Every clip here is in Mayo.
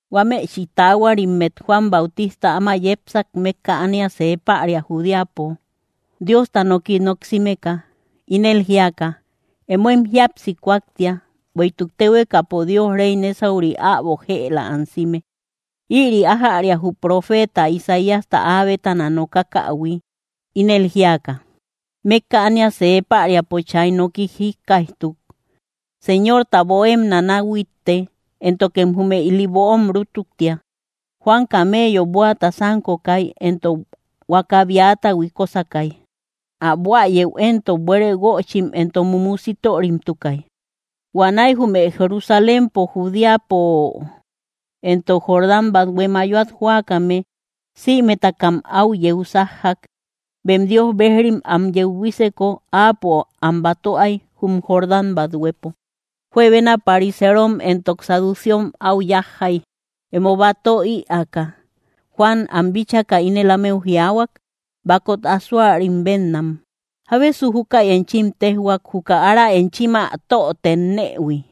Huámechi taahuarimmet Juan Bautista áma yepsak mékka ánia see päria Judeapo, Diosta noki noksimeka ínel jíaka: —Emóem jíapsi kúaktia, bueïtuk téhuekapo Dios réy nésauri äbo jëla ansime. Ïri ájäria jü profeeta Isaíasta áa bétana nokakähui, ínel jíaka: Mékka ánia see päriapo chay noki jikkaijtuk: “Señorta böomem nanahuitte, éntokem jume ili böom rútuktia.” Juan camello bóata sánkokay, entok huakäbiata huikosakay; ä buäyeu éntok buere guöchim entok mumu sitörimtukay. Huanäi jume Jerusalénpo, Judeapo, entok Jordán bathue mayoat jóakame sïmetakam áu yeu sájjak. Bem Dios bejrim am yeu buíseko, áapo am batöay jum Jordán bathuepo. Juebena pariserom entok saduseom áu yájjay, emo batö ïaaka. Juan am bíchaka ínel ámeu jiaahuak: —¡Bakot asoarim bénnam! ¿Jábesu júkäi enchim téjhuak, juka ára enchim ä tö tennëhui,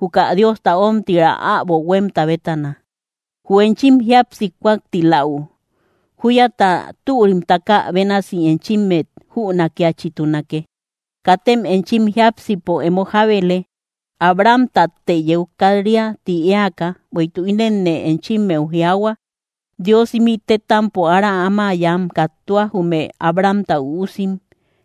juka Diosta ómtiraa äbo huémta bétana? ¡Jü enchim jíapsi kúaktiläu, júyata türim takä bénasi enchimmet jünakiachitunake! Katem enchim jiápsipo emo jábele: “Abrahamtatte yeu kat‑ria” ti éaka, bueïtuk ínenne enchimmeu jiaahua: Dios ímï tétampo ára áma yam kattua, jume Abrahamta üusim.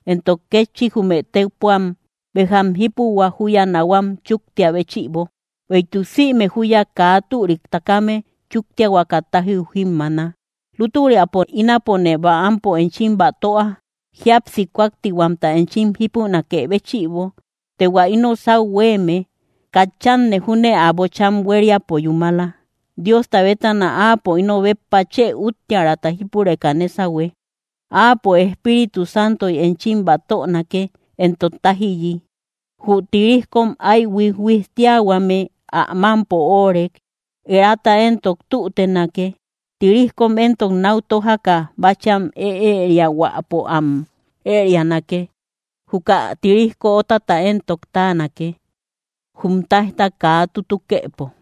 Entok kétchi, jume tépuam béjam jípuhua, júya nahuam chúktiä béchïbo; bueïtuk sïme júya kaa türik takame chúktiahuaka tájiu jímmaana. Lútüriapo, ínapone bäampo enchim batöa, jíapsi kúaktihuamta enchim jípunakë béchïbo; të hua íno sáu huéeme, katchanne júne ä bocham huériapo yúmala, Diosta bétana Áapo ino béppa chë úttiärata jípureka nésahue. Áapo, Espíritu Santoy enchim batönake, entok tájiyi. Jü tirijkom áy huijhuijtiahuame ä mámpo óorek; erata éntok tútenake, tirijkom éntok náu tójaka, báchiam ëeriahuäpo am ërianake; juka tirijko ótata éntok táanake, jum táijta kaa tutukëpo.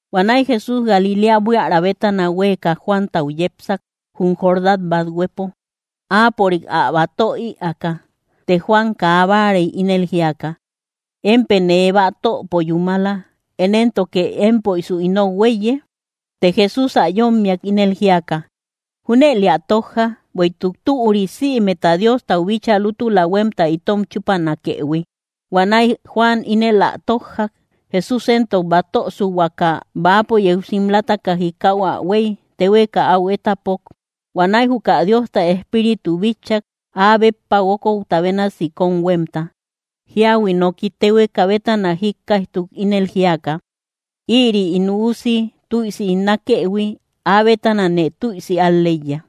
Huanäi Jesús Galiléa buiära bétana huéeka Juantau yepsak, jum Jordán bathuepo, áapörik ä batö ïaaka. Të Juan kaa báarey, ínel jíaka: —Émpë nee batöpo yúmala. ¿Én éntoke émpoisu inou huéiye? Të Jesús ä yómmiak, ínel jíaka: —Júnëlë ä tójja, bueïtuk türi sïmeta Diostau bíchaa lútula huémta itom chúpanakëhui. Huanäi Juan ínel ä tójjak. Jesús entok batösuhuaka, bäapo yeu simlataka jikau ä huey téhueka áu étapok. Huanäi juka Diosta Espíritu bitchak, áa béppa guókouta bénasi kóm huémta. Jíahui nooki téhueka bétana jíkkaijtuk, ínel jíaka: —Ïri ín Üusi tüisi ín nákëhui; áa bétanane tüisi al‑leiya.